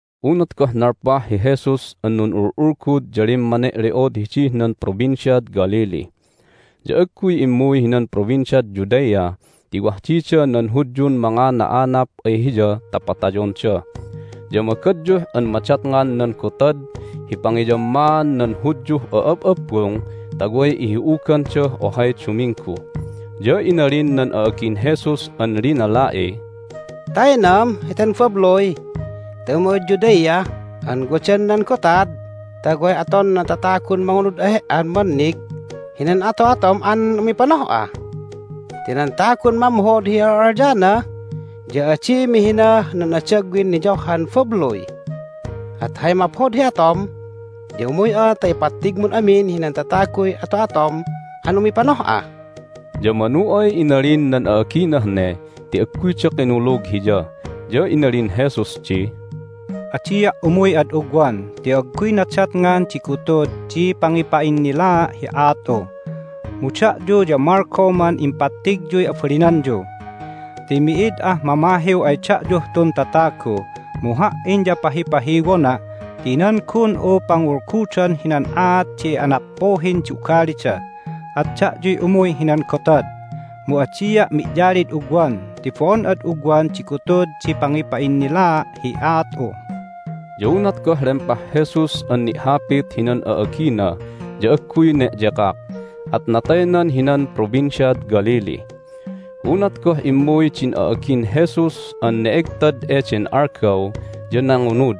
Unat goh nalpah hi Jesus an nun'ul'ulgud ya limmane'le'od hidih nan Provinciad Galilee. Ya agguy immuy hinan Provinciad Judea ti wah dida nan Hudyun mangana'anap ay Hiya ta patayonda. Ya magadyuh an madatngan nan Gotad hi Pangiyammaan nan Hudyuh A'ab'abbung ta way ihi'ugandah ohay duminggu. Ya inalin nan a'agin Jesus an linala'iy, "Taynam heten babluy ta umuy'ad Judea an wadan nan gotad ta way aton nan tatagun mangunud ay He"an mannig hinan ato'atom an umipanoh'a! Ti nan tagun mamhod hi a'al'alyana ya adi mihinah nan adagwin niyohhan babluy! At hay maphod hi atom ya umuy'a ta ipattigmun amin hinan tataguy ato'atom an umipanoh'a!" Ya manu ay inalin nan a'aginah ne ti agguyda kinulug Hiya. Ya inalin Jesus di, "Adia' umuy ad ugwan ti agguy nadatngan di gutud di pangipa'innilaa' hi aat'u, mu da'yu ya malgoman impattigyuy abalinanyu. Ti mi'id ah mamahiw ay da'yuh tun tatagu, mu Ha"in ya pahipahiwona' ti nan gun'u pangulgudan hinan aat di anappuhin di ugalida. At da'yuy umuy hinan gotad, mu adia' mi'yalid ugwan ti bo'on ad ugwan di gutud di pangipa'innilaa' hi aat'u." Ya unat goh lempah Jesus an ni'hapit hinan a'agina ya agguy ne'yekak, at nataynan hinan Provinciad Galilee. Hay Inayan Jesus an Ne'egtad Unat goh immuy din a'agin Jesus an ne'egtad eden algaw ya nangunud,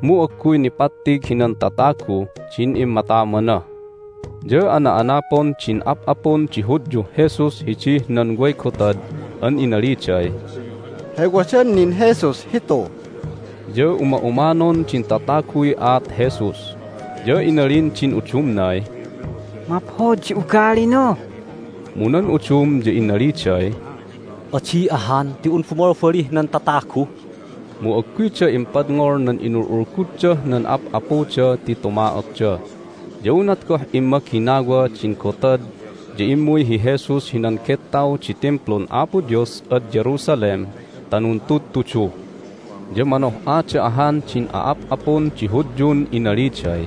mu agguy nipattig hinan tataguh din immatamana. Ya ana'anapon din ap'apun di Hudyuh Jesus hidih nan way gotad an inaliday, "Hay wadan nin Jesus hitu?" Ya uma'umanon din tataguy aat Jesus, ya inalin din udumnay, "Maphod di ugalina!" Mu nan udum ya inaliday, "Adi ahan ti un bumalbalih nan tatagu!" Mu agguyda impadngol nan inul'ulguddah nan ap'apuda ti tuma'otda. Ya unat goh immaginawa din gotad ya immuy hi Jesus hinan gettaw di Timplun Apo Dios ad Jerusalem ta nuntudtudu. Ya manoh'ada ahan din a'ap'apun di Hudyun inaliday,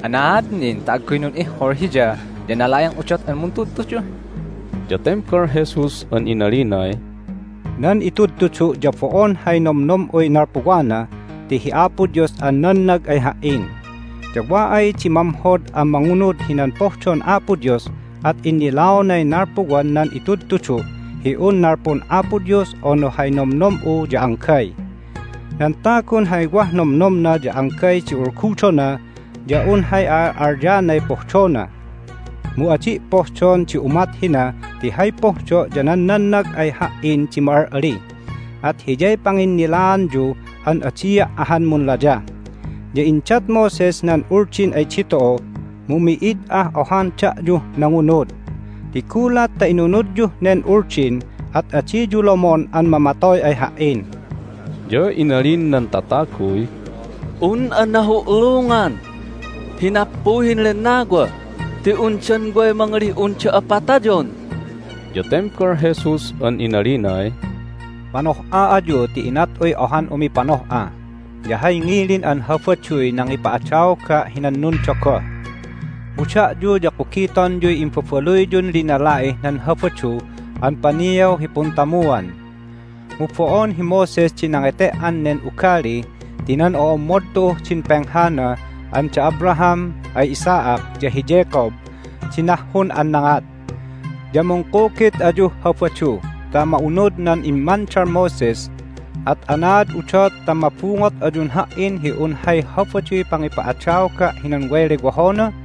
"Anaad nin ta agguy nun'ihkul Hiya ya nala'eng udot an muntudtudu?" Ya tembal Jesus an inalinay, "Nan itudtudu' ya bo'on hay nomnom'uy nalpuwana ti hi Apo Dios an nannag ay Ha"in. Ya wa ay di mamhod an mangunud hinan pohdon Apo Dios at innilaonay nalpuwan nan itudtudu' hi un nalpun Apo Dios unu hay nomnom'u ya anggay. Nan tagun hay wah nomnomna ya anggay di ulgudona ya un hay a'al'alyanay pohdona. Mu adi' pohdon di umat hina ti hay pohdo' ya nan nannag ay Ha"in di ma'al'ali. At hiyay panginnilaanyu an adia' ahan munlayah. Ya indat Moses nan Uldin ay ditu'u, mu mi'id ah ohan da'yuh nangunud! Ti gulat ta inunudyuh nen Uldin at adiyu lomon an mamatoy ay Ha"in!" Ya inalin nan tataguy, "Un'a nahu'lungan hi nappuhin lennawa ti undan way mangalih un da'a patayon?" Ya tembal Jesus an inalinay, "Manoh'a ayu ti inat'uy ohan umipanoh'a, ya hay ngilin an Habaduy nangipa'adaoga' hinan nundogoh. Mu da'yu ya kugitonyuy imbabaluyyun linala'ih nan Habadu an paniaw hi puntamuan (mu bo'on hi Moses di nangete"an nen ugali ti nan o'ommod tu'uh din penghana an da Abraham ay Isaac, ya hi Jacob di nahhun an nangat). Ya mungkugit ayuh Habadu ta ma'unud nan immandal Moses, at anaad udot ta mabungot ayun Ha"in hi un hay Habaduy pangipa'adaoga' hinan way lewohona?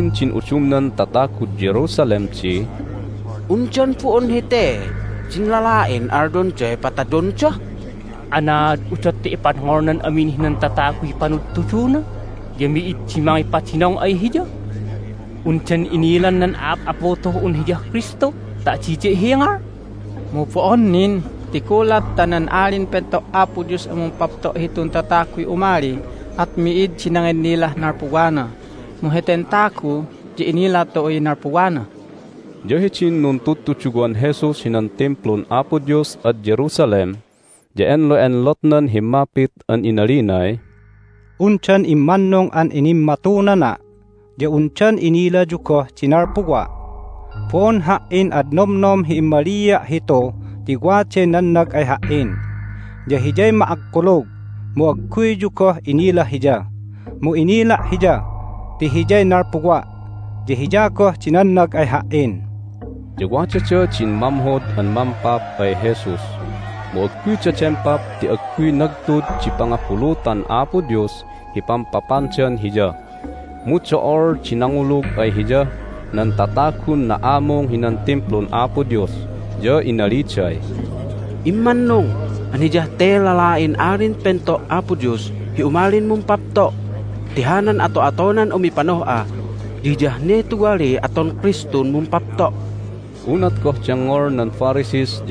Inalin din udumnan tatagud Jerusalem di, "Undan bo'on hete din lala'in alyonday patayonda? Anaad udot ta ipadngolnan amin hinan tataguy panudtuduna, ya mi'id di mangipadinong ay Hiya? Undan inilan nan a'ap'apu tu'uh un Hiyah Kristu ta adida ihingal? Mu bo'on nin, ti gulat ta nan Alin Pento' Apo Dios an mumpapto' hitun tataguy umali at mi'id di nanginnilah nalpuwana, mu heten tagu ya inila tu'uy nalpuwana." Ya hidin nuntudtuduwan Jesus hinan Timplun Apo Dios ad Jerusalem ya enlo'enlotnan himmapit an inalinay, "Undan immannung an inimmatunana'? Ya undan inilayu goh di nalpuwa'? Bo'on Ha"in ad nomnom hi immalia' hitu ti waday nannag ay Ha"in, ya Hiyay ma'akkulug, mu agguyyu goh inila Hiya. Mu inila' Hiya ti Hiyay nalpuwa', ya Hiya goh di nannag ay Ha"in." Ya wadada din mamhod an mampap ay Jesus, mu agguyda dempap ti agguy nagtud di pangabulutan Apo Dios hi pampapandan Hiya. Mu do'ol di nangulug ay Hiyah nan tatagun na'amung hinan Timplun Apo Dios, ya inaliday, "Immannung an Hiyah te lala'in Alin Pento' Apo Dios hi umalin mumpapto' ti hanan ato'atonan umipanoh'a, ya hiyah ne tuwaliy aton Kristun mumpapto'!" Hay Nannagandah nan Tindalun Mampap ay Jesus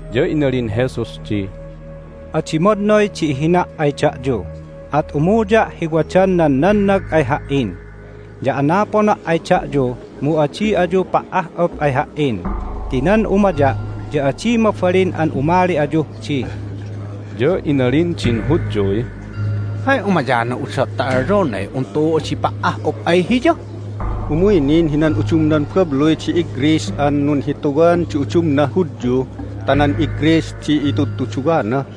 Ya inalin Jesus di, "Adi madnoy di ihina' ay da'yu, at umuya' hi wadan nan nannag ay Ha"in. Ya anapona' ay da'yu, mu adi ayu pa"ah'up ay Ha"in ti nan umaya' ya adi mabalin an umali ayuh di." Ya inalin din Hudyuy, "Hay umayana udot ta alyonay un tu'u adi pa"ah'up ay Hiya? Umuy nin hinan udumnan babluy di iGreece an nunhituwan di udumnah Hudyu ta nan iGreece di itudtuduwana?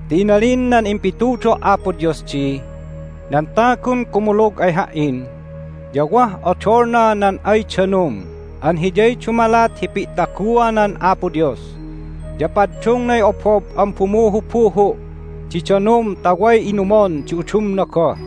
Ti inalin nan impitudo' Apo Dios di, Nan tagun kumulug ay Ha"in ya wah odolna nan ay danum an hiyay dumalat hi pi'taguanan Apo Dios, ya paddungnay obob an bumuhubuhu' di danum ta way inumon di udumna goh."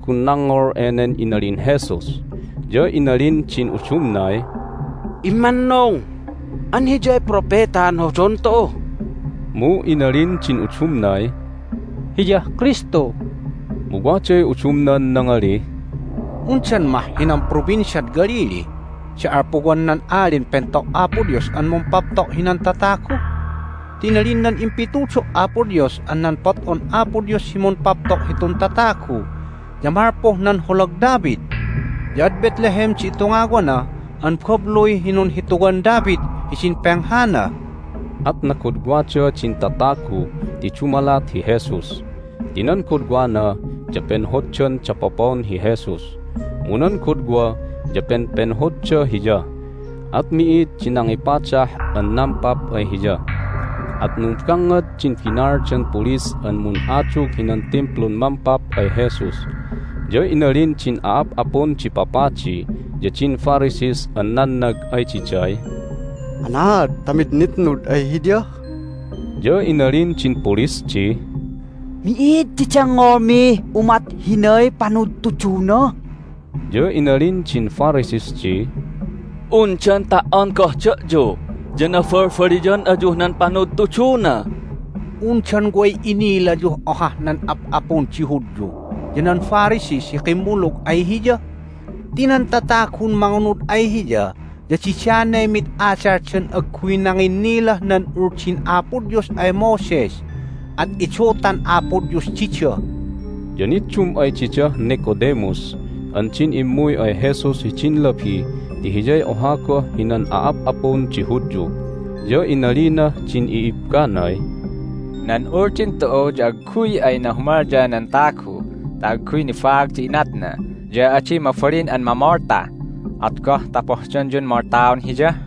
Do'olday tatagun nangngol enen inalin Jesus, ya inalin din udumnay, "Immannung an Hiyay Propetan hodon tu'u!" Mu inalin din udumnay, "Hiyah Kristu!" Mu waday udumnan nangalih, "Undan mah hinan Provinciad Galilee di alpuwan nan Alin Pento' Apo Dios an mumpapto' hinan tatagu? Ti inalin nan impitudo' Apo Dios an nan pot'on Apo Dios hi mumpapto' hitun tatagu ya malpuh nan holag David, ya ad Bethlehem di itungawana an babluy hi nunhituwan David hidin penghana." At nagodwada din tatagu ti dumalat hi Jesus ti nan godwana ya penhoddan dapopon hi Jesus, mu nan godwa ya penpenhodda Hiya. At mi'id di nangipadah an nampap ay Hiya. At numbangngad din binaaldan pulis an mun'adug hinan Timplun mampap ay Jesus. Ya inalin din a'ap'apun di papadi ya din Pharisees an nannag ay diday, "Anaad ta mid initnud Hiya?" Ya inalin din pulis di, "Mi'id di dengngolmih umat hinay panudtuduna!" Ya inalin din Pharisees di, "Undan ta"on goh da'yu ya nabalbaliyan ayuh nan panudtuduna? Undan way inilayuh ohah nan ap'apun di Hudyu ya nan Pharisees hi kimmulug ay Hiya? Ti nan tatagun mangunud ay Hiya ya didanay mid adaldan agguy nanginnilah nan Uldin Apo Dios ay Moses, at idutan Apo Dios dida!" Ya niddum ay didah Nicodemus an din immuy ay Jesus hidin labi ti hiyay oha goh hinan a'ap'apun di Hudyu, ya inalinah din i'ibbanay, "Nan Uldin tu'u ya agguy ay nahumalya nan tagu ta agguy nibaag di inatna ya adi mabalin an mamolta. At goh ta pohdonyun moltaon Hiya?"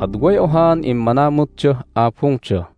At way ohaan immanamutdah abungda.